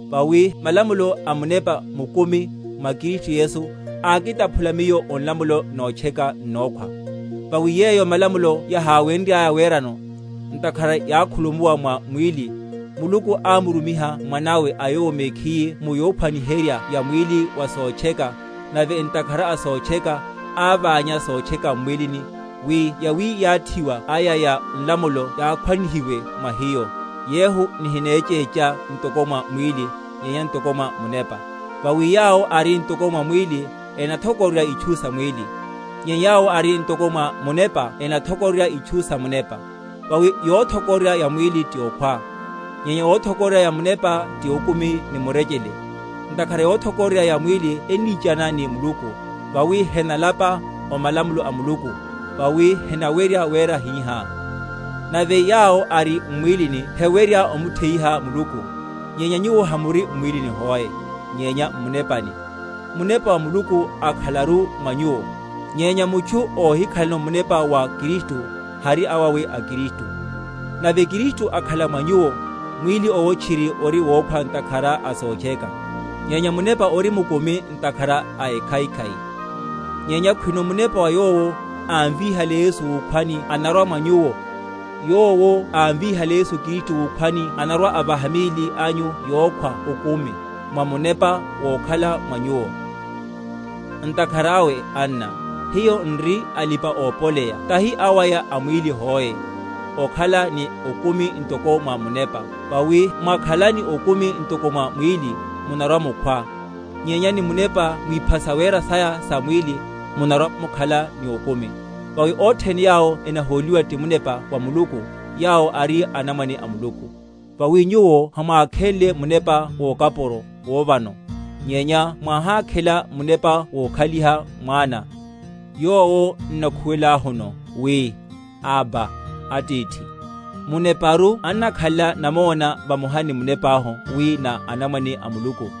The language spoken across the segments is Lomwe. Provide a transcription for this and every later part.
Vawi malamulo a munepa mukumi mwa Kristu Yesu ákitaphula miyo o nlamulo notcheka n’nokhwa. Vawi yeyo malamulo yaháwenryaya werano, ntakhara yákhulumuwa mwa mwíli, Muluku ámurumiha Mwanawe a Yowo mekhiye mu yophwaniherya ya mwíli wa sotcheka, nave ntakhara a sotcheka, aványa sotcheka m’mwílini; wi yawiyathiwa aya ya malamulo yakhwánihiwe mwa hiyo, yehu nihinechécha ntoko mwa mwíli, nyenya ntoko mwa munepa. Vawi yawo ari ntoko mwa mwíli enathokororya itchu sa mwíli; nyenya yawo ari ntoko mwa munepa enathokororya itchu sa munepa: vawi yothokororya ya mwíli ti okhwa; nyenya yothokororya ya munepa ti okumi ni murechele. Ntakhara yothokororya ya mwíli ennichana ni Muluku; vawi henalapa o malamulo a Muluku, vawi henawerya wera hihá. Nave yawo ari m’mwílini hewerya omutheyiha Muluku. Nyenya nyuwo hamuri m’mwílini hoe, nyenya m’munepani, Munepa wa Muluku ákhalakaru mwa nyuwo. Nyenya mutchu óhikhalano Munepa wa Kristu, hari awawe a Kristu. Nave Kristu akhala mwa nyuwo, mwíli owo tchiri ori wokhwa ntakhara a sotcheka; nyenya munepa ori mukumi ntakhara a ekhaikhai. Nyenya khwino Munepa wa Yowo ámvíhale Yesu wukhwani anakhalakaru mwa nyuwo, Yowo ámvíhale Yesu Kristu wukhwani anarwa‐avaha míli anyu yokhwa okumi, mwa Munepa wokhala mwa nyuwo. Hiyo na anamwane a Muluku. Ntakhara awe, anna, hiyo n’ri alipa‐opoleya tahi awaya a mwíli hoe, okhala ni okumi ntoko mwa munepa; vawi mwakhala ni okumi ntoko mwa mwíli, munarwa‐mukhwa; nyenya ni munepa mwipha sawera saya sa mwíli, munarwa‐mukhala ni okumi. Vawi othene yawo enahóliwa ti Munepa wa Muluku, yawo ari anamwane a Muluku. Vawi nyuwo hamwákhenle munepa wokapuro wóvano; nyenya mwáhákhela munepa wokhaliha mwana, yowo n’nakhuwelahuno, wi, Abba, Atithi. Muneparu annakhalela namona vamoha ni munepahu, wi na anamwane a Muluku;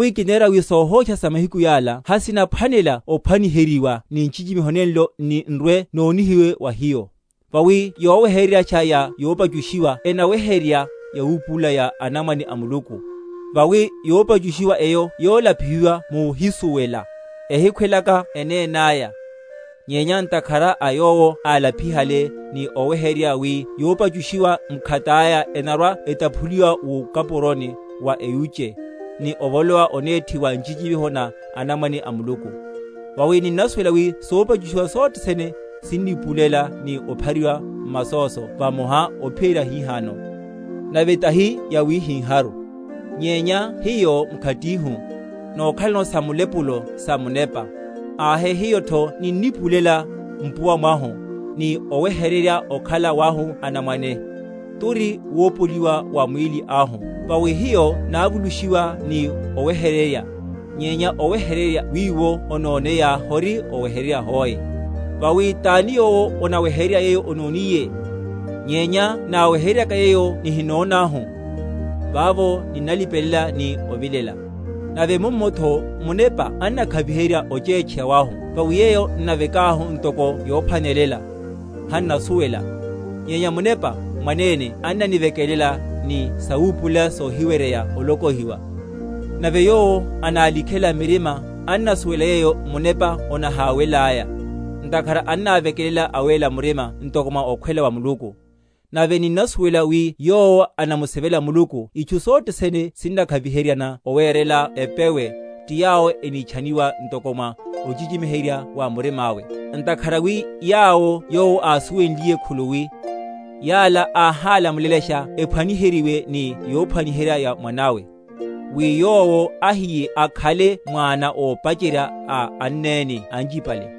Vawi kinera wi sóhósha sa mahiku yala hasinaphwanela ophwaniheryiwa ni nchichimiho nenlo nni n’rwe‐nonihiwe wa hiyo. Vawi yowehereryasha ya yopachushiwa enaweherya yawupulula ya anamwane a Muluku. Vawi yopachushiwa eyo yolapihiwa múhísuwela, ehikhwelaka enénáya, nyenya ntakhara a yowo álapihale, ni owehererya wi yopachushiwa mkhataya enarwa‐etaphuliwa wukapuroni wa eyúche, ni ovolowa onethi wa nchichimiho na anamwane a Muluku. Vawi ninnasuwela wi sopachushiwa sothe sene sinnipulela, ni ophariwa m’masóso vamoha ophiyerya hihano. Nave tahi yawihiharu, nyenya hiyo mkhatihu, nokhalano sa mulepulo sa munepa, ahe hiyotho ninnipulela mpuwa mwahu, ni owehererya okhala wahu anamwane, turi, wopoliwa wa mwíli ahu. Vawi hiyo návulushiwa ni owehererya; nyenya owehererya wiwo ononeya hori owehererya hoe; vawi tani yowo onawehererya yeyo ononiye? Nyenya náwehereryaka yeyo nihinonahu, vavo ninnalipelela ni ovilela. Nave mummotho Munepa annakhaviherya ochetcheya wahu; vawi yeyo n’navekahu ntoko yophwanela, hannasuwela; nyenya Munepa mwanene annanivekelela ni sawipulela sohiweryeya olokohiwa; nave Yowo análikhela m’mirima annasuwela yeyo Munepa onaháwelelaya, ntakhara annavekelela awéla murima ntoko mwa okhwela wa Muluku. Nave ninnasuwela wi yowo anamusivela Muluku itchu sothe sene sinnakhaviheryana owerela epewe, ti yawo enitchaniwa ntoko mwa ochichimiherya wa murima’we. Ntakhara wi yawo Yowo ásuwelenliye khuluwi, yala áhálamulelasha ephwaniheryiwe ni yophwaniherya ya Mwana’we, wi Yowo ahiye akhale mwana ópacherya a anneni anchipale;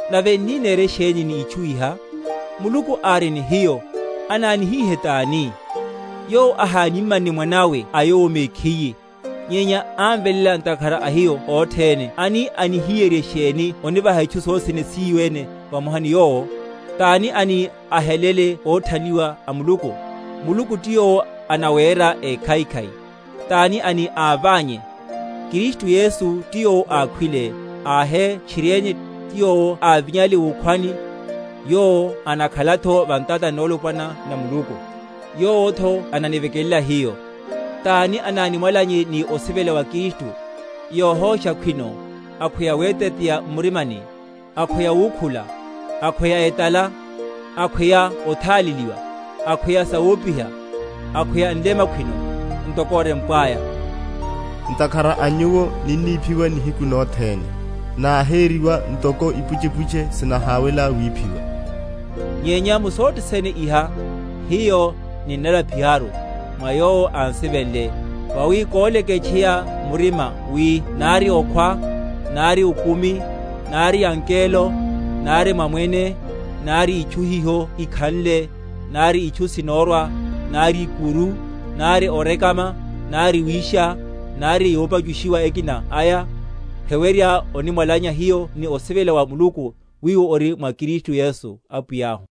Nave n’ni nere sheni ni itchu iha? Muluku ári ni hiyo, anánihihe tani? Yowo ahánimanne Mwana’we a Yowo mekhiye, nyenya ámveléla ntakhara a hiyo othene ani ahiyerye sheni onivahatho hiyo itchu sothe sene síyo ene vamoha ni Yowo? Tani ani ahelele óthanliwa a Muluku? Muluku ti Yowo anawéra ékhaikhai; tani ani áványe? Kristu Yesu ti yowo ákhwile, ahe tchiriene, ti yowo ávinyale wukhwani, yowo anakhalatho va ntatani nolopwana na Muluku, yowotho ananivekelela hiyo. Tani anánimwalanye ni osivela wa Kristu? Yóhósha khwino, akhweya weteteya m’murima, akhweya wukhula, akhweya etala, akhweya otháleliwa, akhweya sawopiha, akhweya nlema khwino? Ntokotho orempwaya, Ntakhara a nyuwo ninniphiwa nihiku nothene; Náhériwa ntoko ipuchepuche sinaháwela wiphiwa. Nyenya mu sothe sene iha, hiyo ninnalapiharu, mwa yowo án’sivenle. Vawi koleketcheya murima wi nari okhwa, nari okumi, nari angelo, nari mamwene, nari itchu hiho ikhanle, nari itchu sinorwa, nari ikuru, nari orekama, nari wisha, nari yopachushiwa ekinaku aya, heweryeru onimwalanya hiyo ni osivela wa Muluku, wiwo ori mwa Kristu Yesu Apwiyahu.